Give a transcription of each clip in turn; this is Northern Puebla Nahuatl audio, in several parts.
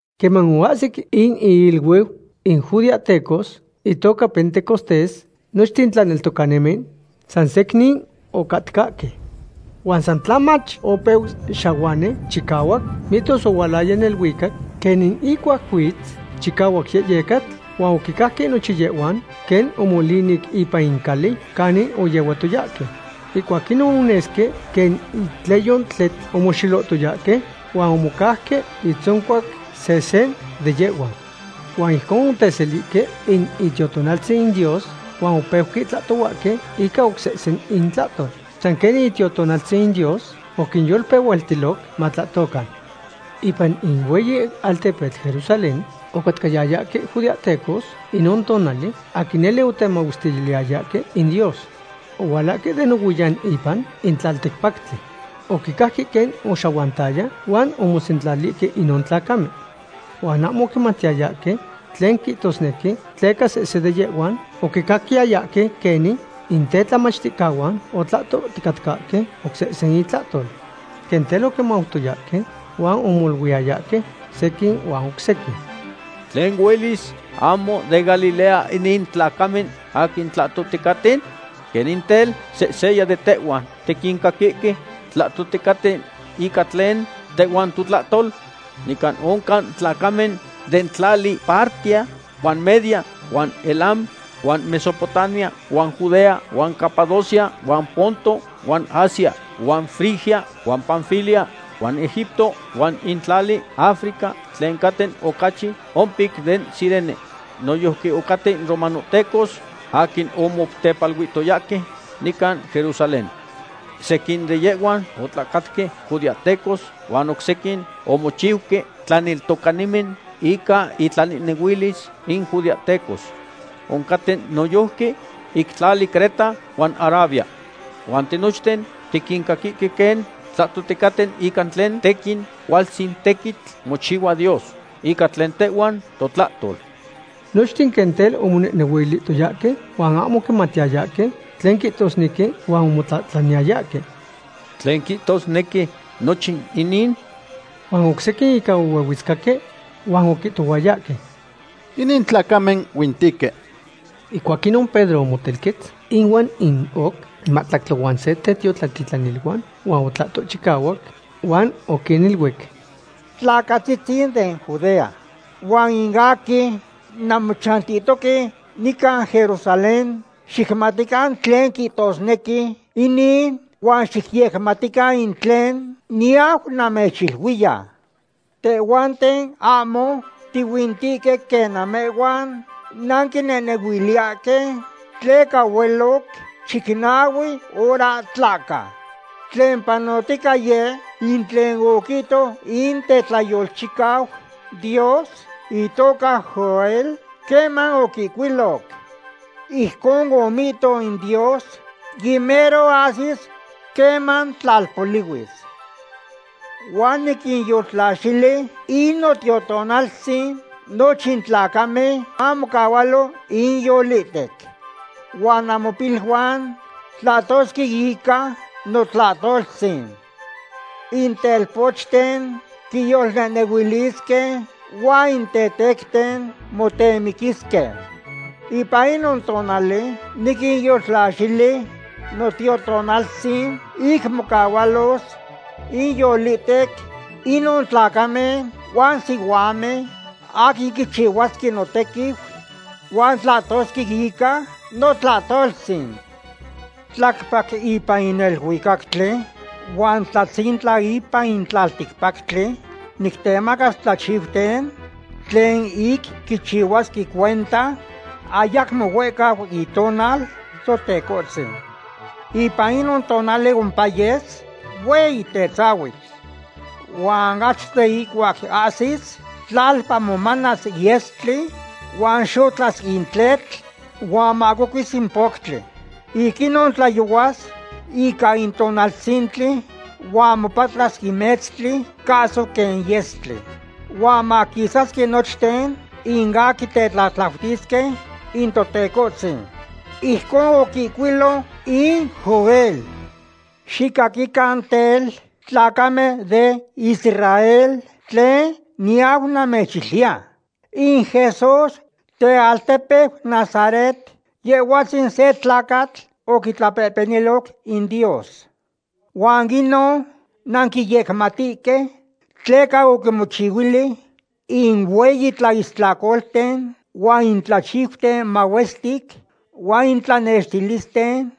Queman oahsic in iiluiu in judeahtecos itoca Pentecostés, nochten in tlaneltocanimen san secnin ocatcahque. Huan san tlamach opeu xahuani chicahuac, mihtos ohualaya neluicac quenin ihcuac huitz chicahuac yehyecatl, huan oquicajque nochin yehhuan quen omolinic ipan in cali canin oyehuatoyahque. Ihcuac inon onesque quen itleyo tletl omoxelohtoyahque huan omocauque itzoncuac sehse de yehhuan. Huan ijcon oteselihque in Itiotonaltzin Dios, huan opeuque tlahtohuahque ica oc sehse intlahtol, san quenin in Itiotonaltzin Dios oquinyolpehualtiloc matlahtocan. Ipan in hueyi altepetl Jerusalén ocatcayayahque judeahtecos inon tonali, aquin nele otemahuestiliyayahque in Dios. Ohualahque de nohuiyan ipan in tlalticpactli. Oquicajque quen oxahuantaya huan omosentlalihque inon tlacamen. Huan ahmo oquimatiyayahque tlen quihtosque tleca sehse de yehhuan oquicaquiyayahque quenin in tetlamachticahuan otlahtoticatcahque oc sehse intlahtol. Quen tel oquimautoyahque huan omoluiyayahque sequin huan oc sequin: ―Tlen huelis; ¿ahmo den Galilea inin tlacamen aquin tlahtohticaten? ¿Quenin tel, sehseya de tehhuan tiquincaquihque tlahtohticaten ica tlen tehhuan totlahtol? Nican oncan tlacamen den tlali Partia huan Media huan Elam huan Mesopotamia huan Judea huan Capadocia huan Ponto huan Asia, huan Frigia huan Panfilia huan Egipto huan in tlali Africa tlen caten ocachi ompic den Cirene. Noyojqui oncaten romanohtecos aquin omotepaluihtoyahque nican Jerusalén. Sequin de yehhuan otlacatque judeahtecos huan oc sequin omochiuque tlaneltocanimen ica itlanehnehuilis in judeahtecos. Oncaten noyojqui ic tlali Creta huan Arabia. Huan tinochten tiquincaquihque quen tlahtohticaten ica tlen tequin cualtzin tequitl mochihua Dios ica tlen tehhuan totlahtol. Nochten quen tel omonehnehuilihtoyahque huan ahmo oquimatiyayahque tlen quihtosnequi, huan omotlahtlaniyayahque: ―¿Tlen quihtosnequi nochin inin? Huan oc sequin ica ohuehuetzcahque huan oquihtohuayahque: ―Inin tlacamen huintihque. Ihcuac inon Pedro omotelquetz ihuan in oc mahtlactli huan se tetiotlatitlaniluan huan otlahto chicahuac huan oquiniluic: ―Tlacatzitzin den Judea huan in aquin nanmochantihtoque nican Jerusalén, xicmatican tlen quihtosnequi inin huan xicyecaquican in tlen niyau namechiluiya. Tehhuanten ahmo tihuintihque quen namehhuan nanquinehnehuiliyahque, tleca hueloc chicnahue hora tlahca. Tlen panohtica yeh in tlen oquihto in tetlayolchicau Dios itoca Joel queman oquihcuiloc: Ijcon omihto in Dios; yimero ahsis queman tlalpolihuis. Huan niquinyoltlaxili in Notiotonaltzin nochin tlacamen mamocahualo inyolihtec. Huan namopiluan tlahtosque ica notlahtoltzin. In telpochten quiyolnehnehuilisque huan in tetecten motemiquisque. Ipan inon tonali niquinyoltlaxili Notiotonaltzin ic mocahualos inyolihtec inon tlacamen huan sihuamen aquin quichihuasque notequiu, huan tlahtosque ica notlahtoltzin. Tlacpac ipan in neluicactli huan tlatzintla ipan in tlalticpactli nictemacas tlachiuten tlen ic quichihuasque cuenta ayacmo huehcau itonal Totecohtzin. Ipan inon tonali ompayes hueyi tetzahuitl; huan achto de ihcuac ahsis, tlalpa momanas yestli huan xotlas in tletl huan mahcocuis in poctli. Ic inon tlayohuas ica in tonaltzintli huan mopatlas in metztli cahso quen yestli. Huan maquisasque nochten in aquin tetlatlautisque in Totecohtzin. Ijcon oquihcuiloc in Joel. ’Xicaquican tel, tlacamen de Israel, tlen niyau namechiluiya. In Jesús tealtepeu Nazaret, Yehhuatzin se tlacatl oquitlapehpeniloc in Dios. Huan inon nanquiyecmatihque tleca oquimochihuili in hueyi tlaistlacolten huan in tlachiuten mahuestic huan in tlanextilisten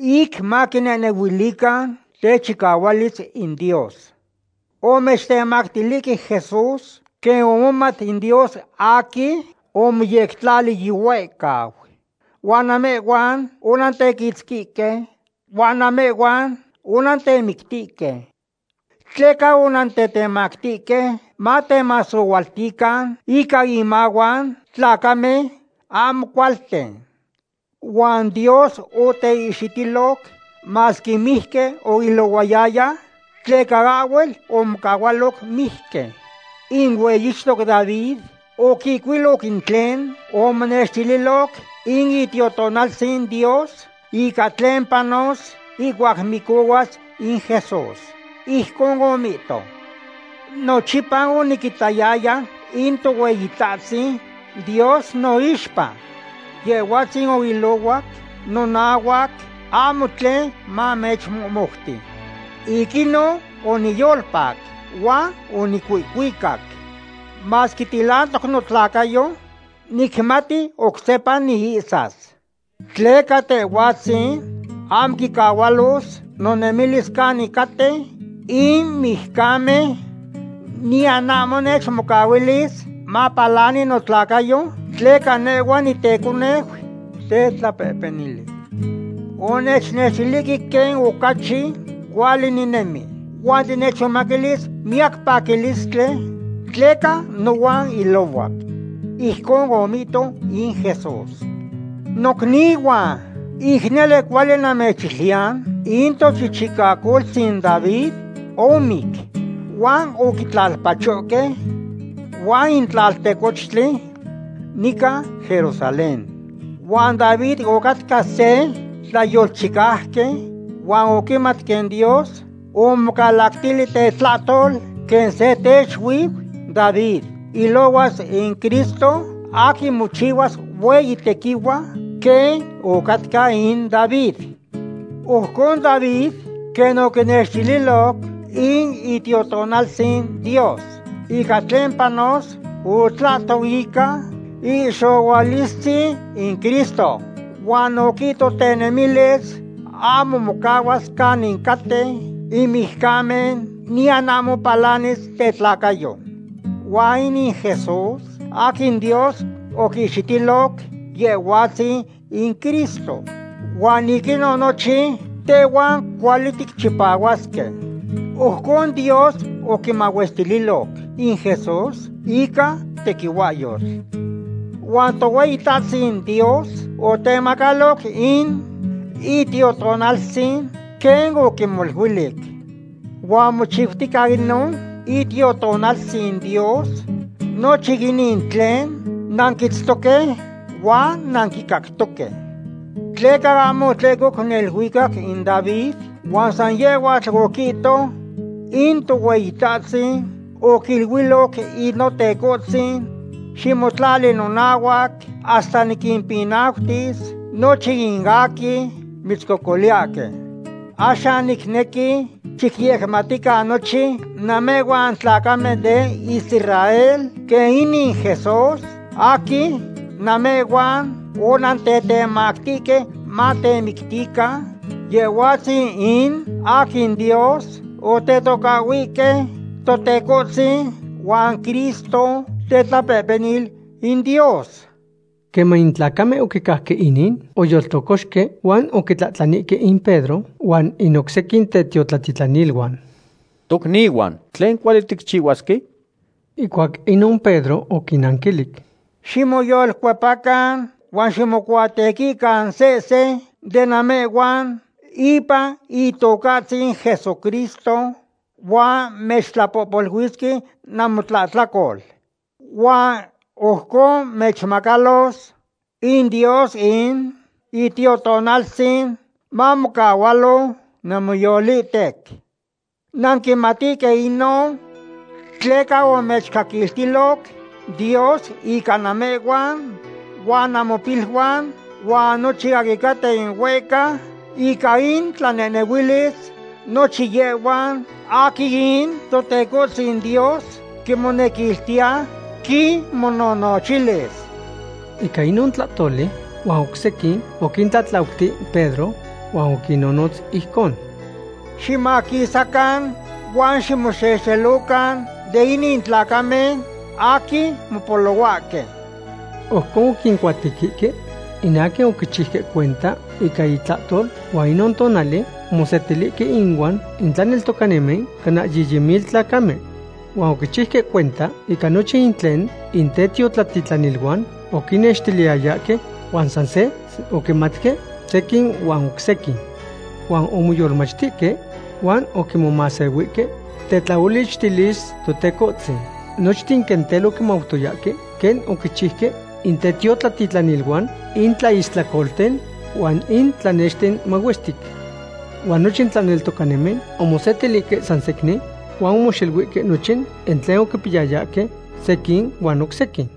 ic maquinehnehuilican techicahualis in Dios. Omechtemactilihque Jesús quen omomat in Dios aquin omoyectlali yihuehcau. Huan namehhuan onantequitzquihque huan namehhuan onantemictihque. Tleca onantetemactihque matemasohualtican ica inmahuan tlacamen ahmo cualten. Huan Dios oteihxitiloc, masque mijqui oilohuayaya, tleca ahhuel omocahualo mijqui. In hueyixtoc David oquihcuiloc in tlen omonextililoc in Itiotonaltzin Dios, ica tlen panos ihcuac micohuas in Jesús. Ijcon omihto: Nochipa oniquitayaya in Tohueyitahtzin Dios noixpa. Yehhuatzin oilohuac nonahuac, ahmo tlen manechmohmoutis. Ic inon oniyolpac, huan onicuihcuicac. Masque tilantoc notlacayo, nicmati oc sepa niihsas; tleca Tehhuahtzin ahmo quicahualos nonemilis canin caten in mijcamen, niyan ahmo nechmocahuilis mapalani notlacayo, tleca nehhuatl niteconeu tetlapehpenil. Onechnextilihque quen ocachi cuali ninemi, huan tinechmomaquilis miyac paquilistli tleca nohuan ilohuac. Ijcon omihto in Jesús. ’Nocnihuan, ic nele cuali namechiluiya in tochichicacoltzin David omic huan oquitlalpachohque huan in tlaltecochtli nican Jerusalén. Huan David ocatca se tlayolchicauqui huan oquimat quen Dios omocalactili tetlahtol, quen se teixuiu David ilohuas in Cristo aquin mochihuas hueyi tequihua quen ocatca in David. Ojcon David, quen oquinextililo in Itiotonaltzin Dios ica tlen panos, otlahto ica ihxohualistzin in Cristo, huan oquihto tenemilis ahmo mocahuas canin caten in mijcamen, niyan ahmo palanis tetlacayo. Huan inin Jesús aquin Dios oquihxitiloc, Yehhuatzin in Cristo, huan ic inon nochin tehhuan cuali ticchipahuasque. Ojcon Dios oquimahuestililoc in Jesús ican tequihuahyotl. Huan Tohueyitahtzin Dios otemacalo in Itiotonaltzin quen oquimoluilic. Huan mochiutica inon Itiotonaltzin Dios nochin inin tlen nanquitztoque huan nanquicactoque. Tleca ahmo otlehcoc neluicac in David, huan san yehhuatl oquihto: In Tohueyitahtzin oquiluiloc in Notecohtzin: “Ximotlali nonahuac hasta niquimpinautis nochin in aquin mitzcocoliyahque.” ’Axan nicnequi xicyecmatican nochin namehhuan tlacamen den Israel quen inin Jesús aquin namehhuan onantetemactihque matemictican, Yehhuatzin in aquin Dios otetocahhuihque Totecohtzin huan Cristo tetlapehpenil in Dios. Queman in tlacamen oquicajque inin, oyoltlocoxque huan oquitlahtlanihque in Pedro huan in oc sequin tetiotlatitlaniluan: ―Tocnihuan, ¿tlen cuali ticchihuasque? Ihcuac inon Pedro oquinnanquilic: ―Ximoyolcuepacan huan ximocuatequican sehse de namehhuan ipan Itocahtzin Jesucristo, huan mechtlapohpoluisque namotlahtlacol. Huan ojcon mechmacalos in Dios in Itiotonaltzin, mamocahualo namoyolihtec. Nanquimatihque inon tleca omechcaquiltiloc Dios ica namehhuan huan namopiluan huan nochin aquin caten huehca ica intlanehnehuilis, nochin yehhuan aquin in Totecohtzin Dios quimonequiltiya quinmononochilis. Ica inon tlahtoli huan oc sequin oquintlatlautic Pedro huan oquinnonotz ijcon: ―Ximaquisacan huan ximoxelocan den inin tlacamen aquin mopolohuahque. Ojcon oquincuatequihque in aquin oquichiuque cuenta ica itlahtol, huan inon tonali omosetilihque inuan in tlaneltocanimen cana yiyi mil tlacamen. Huan oquichiuque cuenta ica nochin in tlen in tetiotlatitlaniluan oquinnextiliyayahque, huan san se oquimatque sequin huan oc sequin. Huan omoyolmachtihque huan oquimomahsehuihque tetlaolichtilis Totecohtzin. Nochten quen tel oquimautoyahque quen oquichiuque in tetiotlatitlaniluan in tlaistlacolten huan in tlanexten mahuestic. Huan nochin tlaneltocanimen omosetilihque san secnin huan omoxeluihque nochin in tlen oquipiyayahque sequin huan oc sequin.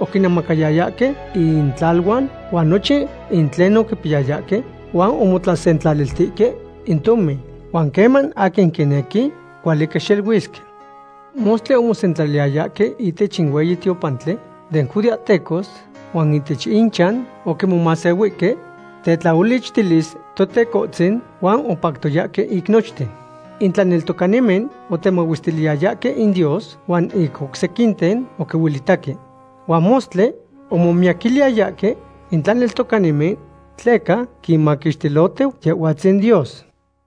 Oquinemacayayahque intlaluan huan nochin in tlen oquipiyayahque huan omotlasentlaliltihque in tomin, huan queman aquin quinequi, cuali quixeluisque. Mostli omosentlaliyayahque ihtech in hueyi tiopantli den judeahtecos, huan ihtech inchan oquimomahsehuihque tetlaolichtilis Totecohtzin huan opactoyahque ic nochten. In tlaneltocanimen otemahuestiliyayahque in Dios, huan in oc sequinten oquinuelitaque. Huan mostli momiyaquiliyahque in tlaneltocanimen tleca quinmaquixtilohtiu Yehhuatzin Dios.